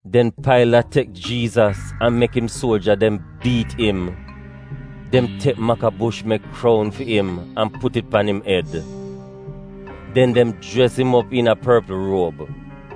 Den Pailat tek Jiizas an mek im suoja dem biit im. Dem tek makabush mek kroun fi im an put it pan im ed. Den, dem jres im op iina porpl ruob.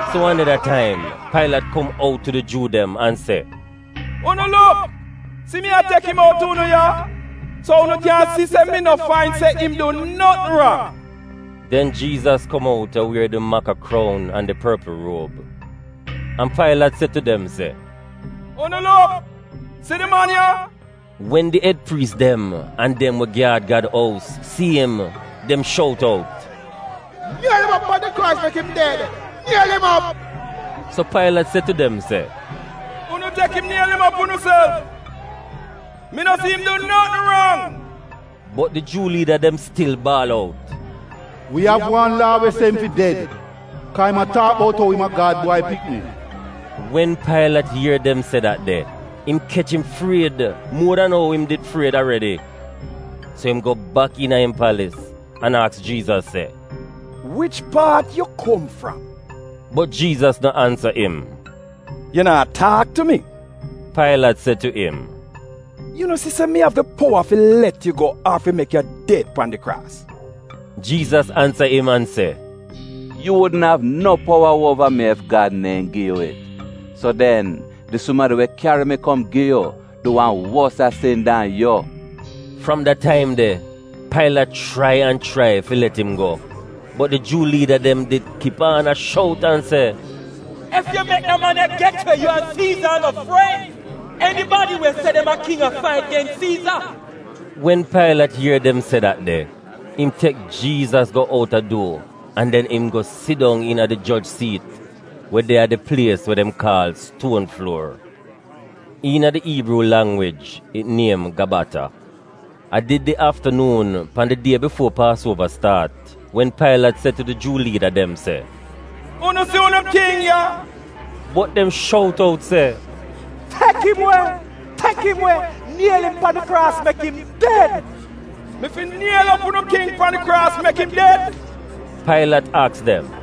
So wan neda taim, Pailat kom out tu di Juu dem an se, “Unu luk, si mi a tek im out tu unu ya, so unu kyan si se mi no fain se im du notn rang!” Den Jiizas kom out a wier di maka kroun an di porpl ruob. An Pailat se tu tu dem se, “Unu luk, si di man ya!” Wen di ed priis dem an dem we gyaad Gad ous si im dem shout out, “Niel im op pan di kraas mek im ded! Niel im op!” So Pailat se tu dem se, “Unu tek im niel im op unuself! Mi no si im du notn rang. Bot di Juu liida dem stil baal out, “Wi av wan laa we se im fi ded, kaa im a taak bout ou im a Gad Bwai Pikni.” Wen Pailat ier dem se dat de, im kech im fried muo dan ou im did fried aredi. So im go bak iina im palis an aks Jiizas se, “Wich paat yu kom fram?” Bot Jiizas no ansa im. “Yu naa taak tu mi?” Pailat se tu im. “Yu no si se mi av di powa fi let yu go ar fi mek yu ded pan it kraas?” Jiizas ansa im an se, “Yu wudn av no powa uova mi ef Gad neehn gi yu it. So den di sumadi we kyari mi kom gi yu du wan wosa sin dan yu.” Fram da taim de, Pailat chrai an chrai fi let im go. Bot di Juu liida dem did kip aan a shout an se, “Ef yu mek da man ya get we, yu an Siiza a no fren! Enibadi we se dem a king a fait gens Siiza.” Wen Pailat ier dem se dat de, im tek Jiizas go outa duo an den im go sidong iina di joj siit we de a di plies we dem kaal “Stuon Fluor.” (Iina di Iibruu langwij it niem Gabata). A did di aaftanuun pan di die bifuo Paasuova staat wen Pailat se tu di Juu liida dem se, “Unu si unu king ya!” Bot dem shout out se, “Tek im we! Tek im we! Niel im pan di kraas mek im ded!” “Mi fi niel op unu king pan di kraas mek im ded?” Pailat aks dem.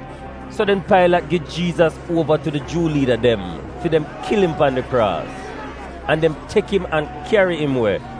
So den Pailat gi Jiizas uova tu di Juu liida dem fi dem kil im pan di kraas. An dem tek im an kyari im we.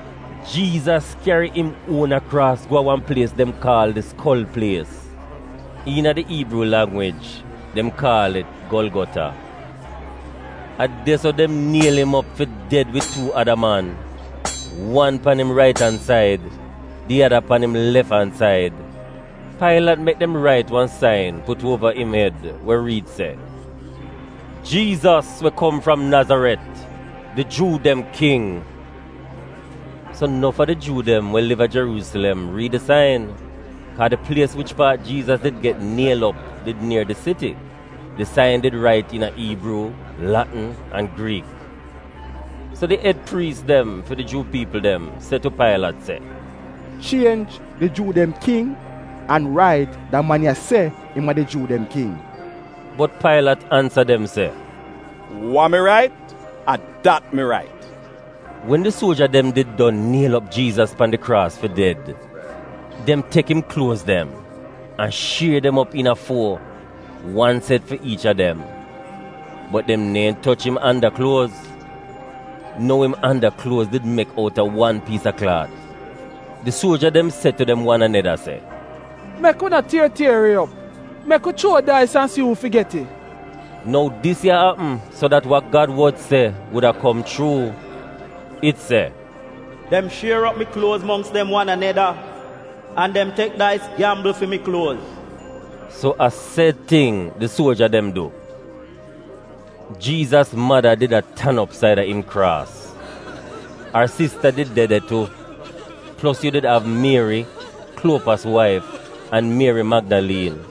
Jiizas kyari im uona kraas go a wan plies dem kaal di Skol Plies (iina di Iibruu langwij, dem kaal it Golgota). A de-so dem niel im op fi ded wid tuu ada man — wan pan im rait-an-said, di ada pan im lef-an-said, an im did migl dem. Pailat mek dem rait wan sain put uova im ed we riid se: “JIIZAS WE KOM FRAM NAZARET, DI JUU DEM KING.” So nof a di Juu dem we liv a Jeruusilem riid di sain, kaa di plies wich paat Jiizas did get niel op did nier di siti. Di sain did rait iina Iibruu, Latn an Griik. So di ed priis dem fi di Juu piipl dem se tu Pailat se, “Chienj ‘Di Juu dem king,’ an rait ‘Da man ya se im a di Juu dem king.’” Bot Pailat ansa dem se, “Wa mi rait, a dat mi rait!” Wen di suoja dem did don niel op Jiizas pan di kraas fi ded, dem tek im kluoz dem, an shier dem op iina fuo, wan set fi iich a dem. Bot dem neehn toch im anda kluoz. (Nou im anda kluoz did mek outa wan piis a klaat.) Di suoja dem se tu dem wan aneda se, “Mek wi no tier tier it op. Mek wi chuo dais an si uu fi get it.” Nou dis ya apm so dat wa Gad wod se wuda kom chuu. It se, “Dem shier op mi kluoz mongks dem wan aneda an dem tek dais gyambl fi mi kluoz.” So a sed ting di suoja dem du. Jiizas mada did a tan op saida im kraas. Ar sista did de de tu, plos yu did av Mieri, Kluopas waif, an Mieri Magdaliin.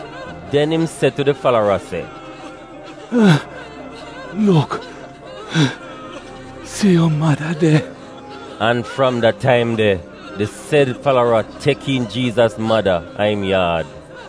Den im se tu di falara se, “Luk, si yu mada de.” An fram da taim de, di sed falara tek iin Jiizas mada a im yaad.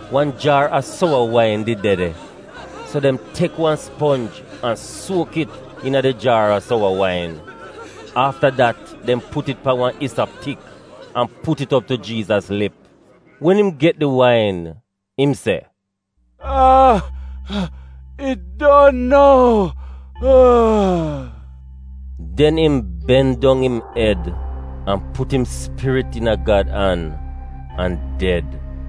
Wan jaar a sowa wain did de de, so dem tek wan sponj an suok it iina di jaar a sowa wain. Afta dat dem put it pan wan isop tik an put it op tu Jiizas lip. Wen im get di wain, im se, “It don nou.” Den im ben dong im ed an put im spirit iina Gad an an ded.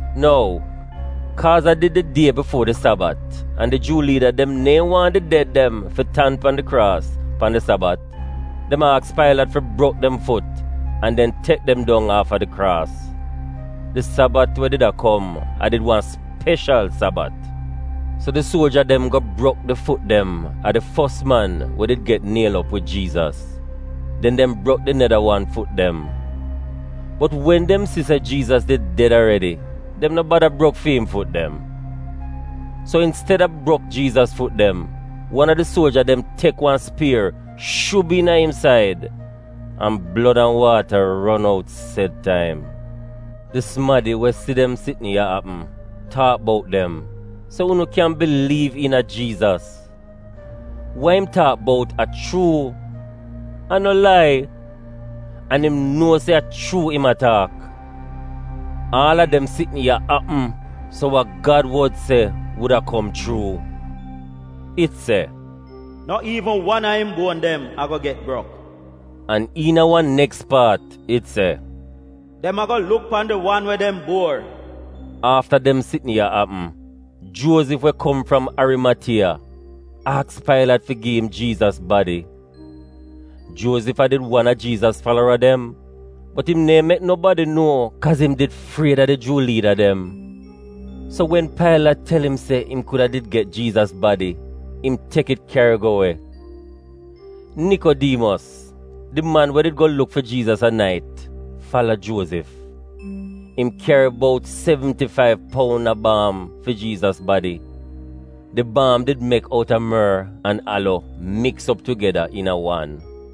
Nou, kaaz a did di die bifo di Sabat an di Juu liida dem neehn wan di ded dem fi tan pan di kraas pan di Sabat dem aks Pailat fi brok dem fut an den tek dong aaf a di kraas. (Di Sabat we did a kom a did wan speshal Sabat.) So di suoja dem go brok di fut dem a di fos man we did get niel op wid Jiizas, den dem brok di neda wan fut dem. Bot wen dem si se Jiizas did ded aredi, dem no bada brok fi im fut dem. So insteda brok Jiizas fut dem, wan a di suoja dem tek wan spier shub iina im said, an blod an waata ron out sed taim. Di sumadi we si dem sitn ya apm taak bout dem, so unu kyan biliiv iina Jiizas. (Wa im taak bout a chuu. A no lai. An im nuo se a chuu im a taak.) Aal a dem sitn ya apm so wa Gad wod se wuda kom chuu. It se, “No iivn wan a im buon dem ago get brok.” An iina wan neks paat it se, “Dem ago luk pan di wan we dem buor.” Afta dem sitn ya apm, Juozif we kom fram Arimatiya, aks Pailat fi gi im Jiizas badi. Juozif a did wan a Jiizas falara dem, bot im neehn mek nobadi nuo kaaz im did fried a di Juu liida dem. So wen Pailat tel im se im kuda did get Jiizas badi, im tek it kyari go we. Nikodiimos, di man we did go luk fi Jiizas a nait, fala Juozif. Im kyari bout sevnti faiv poun a baam fi Jiizas badi. Di baam did mek outa mor an alo miks op tugeda iina wan.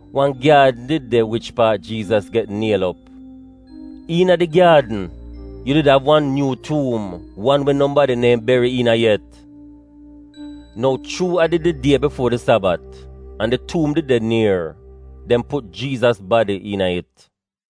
Wan gyaadn did de wich paat Jiizas get niel op. Iina di gyaadn, yu did av wan nyuu tuum, wan we nobadi neehn beri iina yet. Nou chuu a did di die bifuo di Sabat an di tuum did de nier, dem put Jiizas badi iina it.